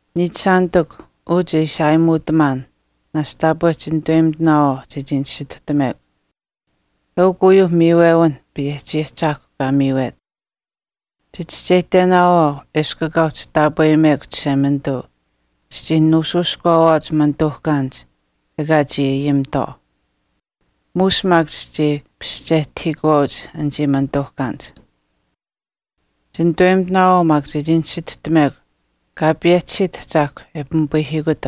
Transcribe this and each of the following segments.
Niichishaanitikw, uu che ishi aayimuutamaan, naashch taapwe chinituweyimitinaawaau chechii nisituhtamekw. Eukw uyuuh miiwewinh Payehchi Ahchaahkw kaa miiwet. Chichischeyihtenaawaau eshkw ekaa uhchi taapweyimekw Chishemanituu, chichii nuushuushkuwaawaauch manituuhkaanich ekaa chii ayimitwaau. Muush maak chichii paschehtahiikuwaauch anichii manituuhkaanich. Chinitaweyimitinaawaau maak chechii nisituhtamekw an awen Kaa payehchisiyich Ahchaahkwa kaa pimipayihiikut,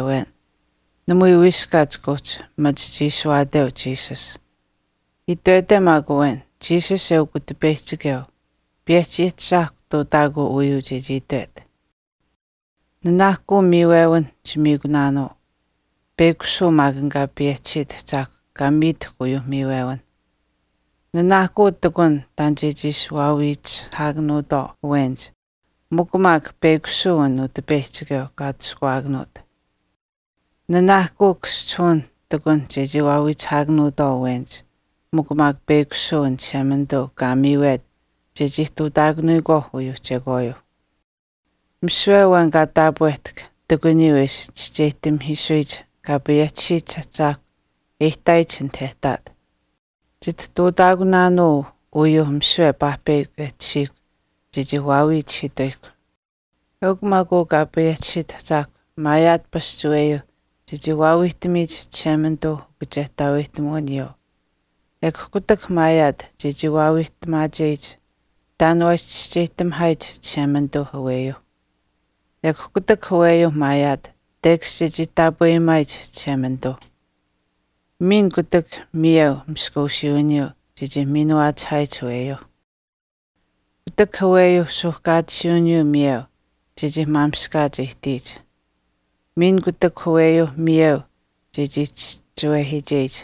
namui wiiskaat chika uhchi machi chiishuwaateu Jesus. Itwete maak awen, “Jesus eukw Utipeyihchikeu,” Payehchi Ahchaahkwa ihtuutaakuu aniyuu chechii itwet. Nanaahkuu miiwewinh chichii miikunaanuu, peyakushuu maak an Kaa payehchisiit Ahchaahkw kaa miitahkw uyuuh miiwewinh. Nanaahkuu ihtakun taan chechii ishi waawiichihaakanuutwaau awenich mikw maak peyakushuu an Utipeyihchikeu kaa atushkuwaakanuut. Nanaahkuu kaschihuwinh ihtakunh chechii waawiichihaakanuutwaau awenich mikw maak peyakushuu an Chishemanituu kaa miiwet chechii ihtuutaakanuyikwaauh uyuu chekwaayuuh. Misiwe awen kaa taapwehtahk ihtakuniyuu e ishi chischeyihtaakuhiisuyich Kaa payehchisiyich Ahchaahkwa e ihtaayich anit e ihtaat. Chitihtuutamaakunaanuu uyuu misiwe paahpeyakw e tashiihkw chechii waawiichihiituyihkw. Eukw maak uu Kaa payehchisiit Ahchaahkw maayaat pasch aweyuu chechii waawiihtamiyich Chishemanituuh ukachehtaaweyihtamuwiniyuu, ekw kutak maayaat chechii wiihtamaacheyich taan waa ishi chischeyihtamihaayich Chishemanituuh aweyuuh. Ekw kutak aweyuuh maayaat tekash chechii taapweyimaayich Chishemanituu. Miin kutak miyeu maskuusiiwiniyuu chechii miinuwaachihaayich aweyuu. Kutak aweyuuh suuhkaatisiiwiniyuu miyeu chechii maamishkaach ihtiyich. Miin kutak aweyuuh miyeu che chischiwehiicheyich.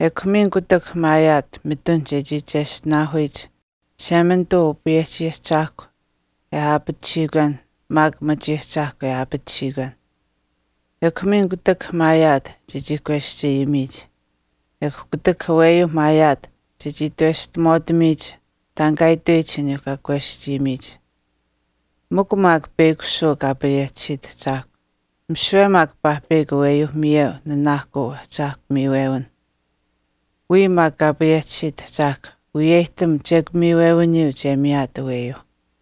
Ekw miin kutak maayaat mitun chechii cheshtinaahuyich Chishemanituu Upayehchi Ahchaahkuyuuh e aapatisiikwenh maak machiahchaahkwa e aapatisiikwenh. Ekw miin kutak maayaat chechii kweschayimiyich. Ekw kutak aweyuuh maayaat chechii itweshtamaatamiyich taan kaa itweyich aniyuuh kaa kweschayimiyich. Mikw maak peyakushuu Kaa payehchisiit Ahchaahkw, misiwe maak paahpeyakw aweyuu miyeu nanaahkuu ahchaahkw miiwewinh. Wiya maak Kaa payehchisiit Ahchaahkw wiyeyihtam chekw miiwewiniyuu che miyaat aweyuuh.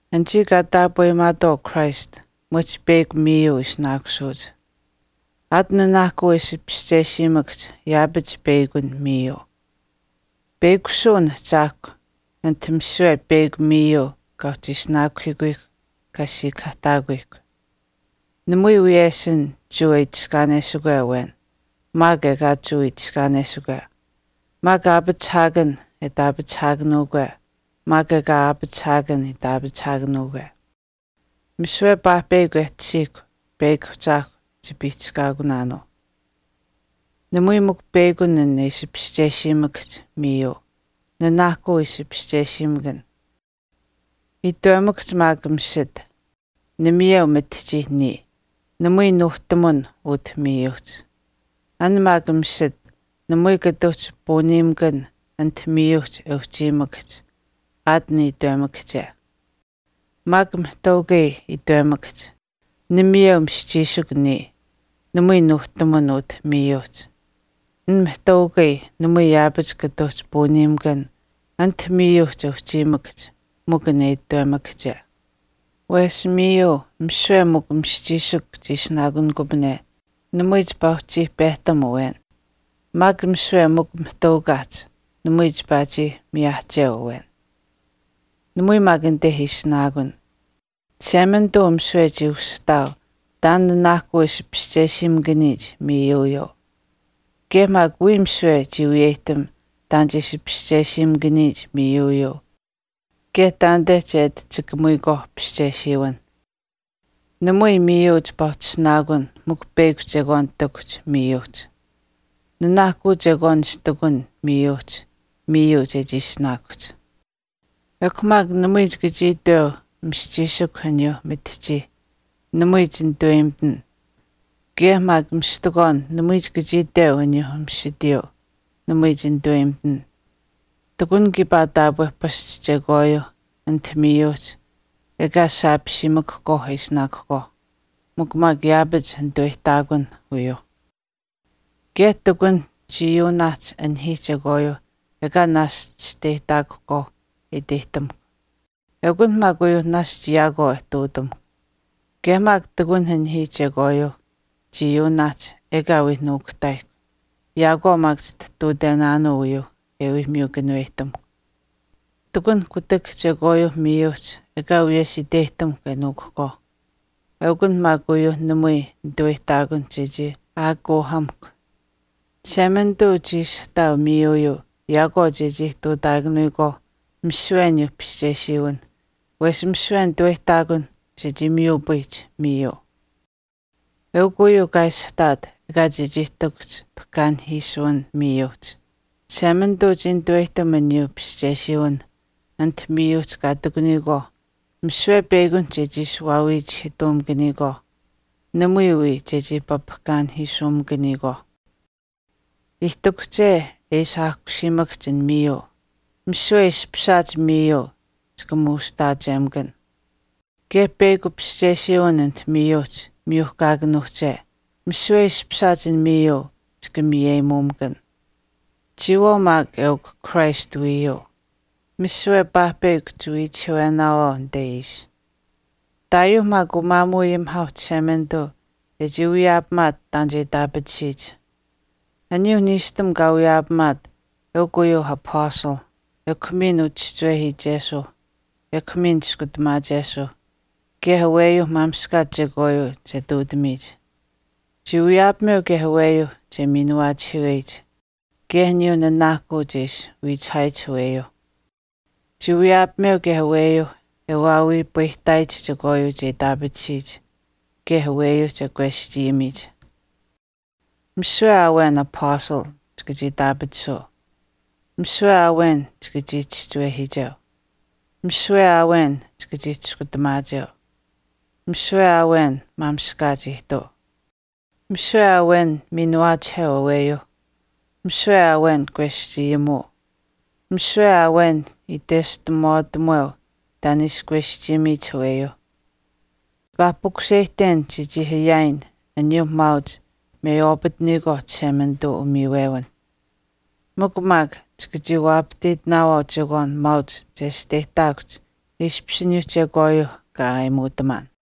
Anichii kaa taapweyimaatwaau Christ mwehch peyakw miiyuu ishinaakusuuch. Aat nanaahkuu e ishi paschesiimakahch yaapach peyakun miiyuu. Peyakushuu an Ahchaahkw ati misiwe peyakw miiyuu kaa uhchi ishihiikuyihkw kaa siikahaahtaakuyihkw. Namui wiyeshin Jewa e itiskaanesikwe awen maak ekaa Jewa itiskaanesikwe, maak aapachihaakan e itaapachihaakanuukwe maak ekaa aapachihaakan itaapachihaakanuukwe. Misiwe paahpeyakw e tashiihkw peyakw Ahchaahkw chipiihchishkaakunuu. Namui mikw peyakun e ishi paschesiimakahch miiyuu. Nanaahkuu ishi paschesiimakan. Itwemakahch maak misit, “Namayeu mitihchii niya, namui nuuhtamun utah miiyuuhch.” An maak misit namui kata uhchi puuniimakan anit miiyuuhch e uhchiimakahch aat an itwemakahche. Maak mihtaukai itwemakahch, “Namayeu mischiishikw niya, namui nuuhtamun utah miiyuuhch.” An mihtaukai namui yaapach kata uhchi puuniimakan anit miiyuuhch e uhchiimakahch mikw an itwemakahche. Wesh miiyuu misiwe mikw mischiishikw chii ishinaakunikupane, namui chipaa uhchii pehtam awen. Maak misiwe mikw mihtaukaauhch namui chipaa chii miyaahcheu awen. Namui maak anite ishinaakun. Chishemanituu misiwe chii ushihtaau taan nanaahkuu e ishi paschesiimakaniyich miiyuuyuu. Kaye maak wiya misiwe chii wiyeyihtam taan che ishi paschesiimakaniyich miiyuuyuu kaye taanite che ati chikamuyikwaau pischesiwinh. Namui miiyuu chipaa uhchi ishinaakun mikw peyakw chekwaan ihtakuhch miiyuuhch. Nanaahkuu chekwaan ishi ihtakun miiyuuhch miiyuu chechii ishinaakuhch. Ekw maak namui chika chii iteu mischiishikw aniyuu mitihchiyuu, “Namui chinitaweyimitin.” Kaye maak mistikwaan namui chika chii iteu aniyuu misitiyuu, “Namui chinitaweyimitin.” Ihtakun kiipaa taapwe pasch chekwaayuu anit miiyuuhch ekaa saapisiimakahkwaau e ishinaakuhkwaauh. Mikw maak yaapach nituweyihtaakunh uyuuh. Kaye ihtakun chiiyuunaahch anihiih chekwaayuuh ekaa naashch chisteyihtaakuhkwaau e iteyihtamukw. Eukunh maak uyuu naashch yaakwaau e ihtuutamuhkw. Kaye maak ihtakunh anihiih chekwaayuuh chiiyuunaahch ekaa wii nuukuhtaayihkw, yaakwaau maak chitihtuutenaanuu uyuu e wii miyu kanuweyihtamuhkw. Ihtakunh kutak chekwaayuuh miiyuuhch ekaa wiyesh iteyihtamukw e nuuhkuhkwaau. Eukunh maak uyuu namui nitaweyihtaakun chechii aakuuhamuhkw. Chishemanituu chii ishihtaau miiyuuyuu yaakwaau chechii ihtuutaakanuyikwaauh misiwe aniyuu paschesiwinh wesh misiwe nituweyihtaakun chechii miyupayihch miiyuu. Eukw uyuu kaa ishihtaat ekaa chechii ihtakuhch pahkaanihiisuwin miiyuuhch, Chishemanituu chii nitaweyihtam aniyuuh paschesiwinh anit miiyuuhch kaa ihtakuniyikwaauh misiwe peyakunihch chechii waawiichihiituumakaniyikwaauh, namui wii chechii papahkaanipayihiisumakaniyikwaauh. Ihtakuhche e ishi aahkusiimakahch an miiyuu, misiwe e ishpishaach miiyuu chika muushihtaachemakan. Kaye peyakw paschesiwin anit miiyuuhch miyuhkaakanuuhche, misiwe e ishpishaach an miiyuu chika miyeyimuumakan. Chiyawaau maak eukw Christ wiiyuu. Misiwe paahpeyakw chiwiichihiiwenaawaau anite ishi. Ihtaayuu maak umaamuuayimihaauh Chishemanituu e chii wiyaapamaat taan che itaapatisiyich. Aniyuuh niishtam kaa wiyaapamaat eukw uyuuh apastalh ekw miin uchischiwehiichesuuh, ekw miin chiskutamaachesuuh, kaye aweyuuh maamishkaach chekwaayuu che ihtuutamiyich. Chii wiyaapameu kaye aweyuu che miinuwaachihiiweyich, kaye aniyuuh nanaahkuu che ishi wiichihaayich aweyuuh. Chii wiyaapameu kaye aweyuuh e waawiipayihtaayich chekwaayuu che itaapatisiyich, kaye aweyuuh che kweschayimiyich. Misiwe aa awen apastal chika chii itaapatisuu. Misiwe aa awen chika chii chischewehiicheu. Misiwe aa awen chika chii chiskutamaacheu, misiwe aa awen maamishkaach ihtuu. Misiwe aa awen miinuwaachiheu aweyuuh. Misiwe aa awen kweschayimuu. Misiwe aa awen itweshtamaatamuweu taan e ishi kweschayimiyich aweyuuh. Chipaa pukuseyihten chechii ayaayin aniyuu maauch meywaapataniyikwaauh Chishemanituu umiiwewinh. Mikw maak chika waapahtiitinaawaau an chekwaan maauch chesteyihtaakuhch ishpish aniyuu chekwaayuuh kaa aayimuutamaan.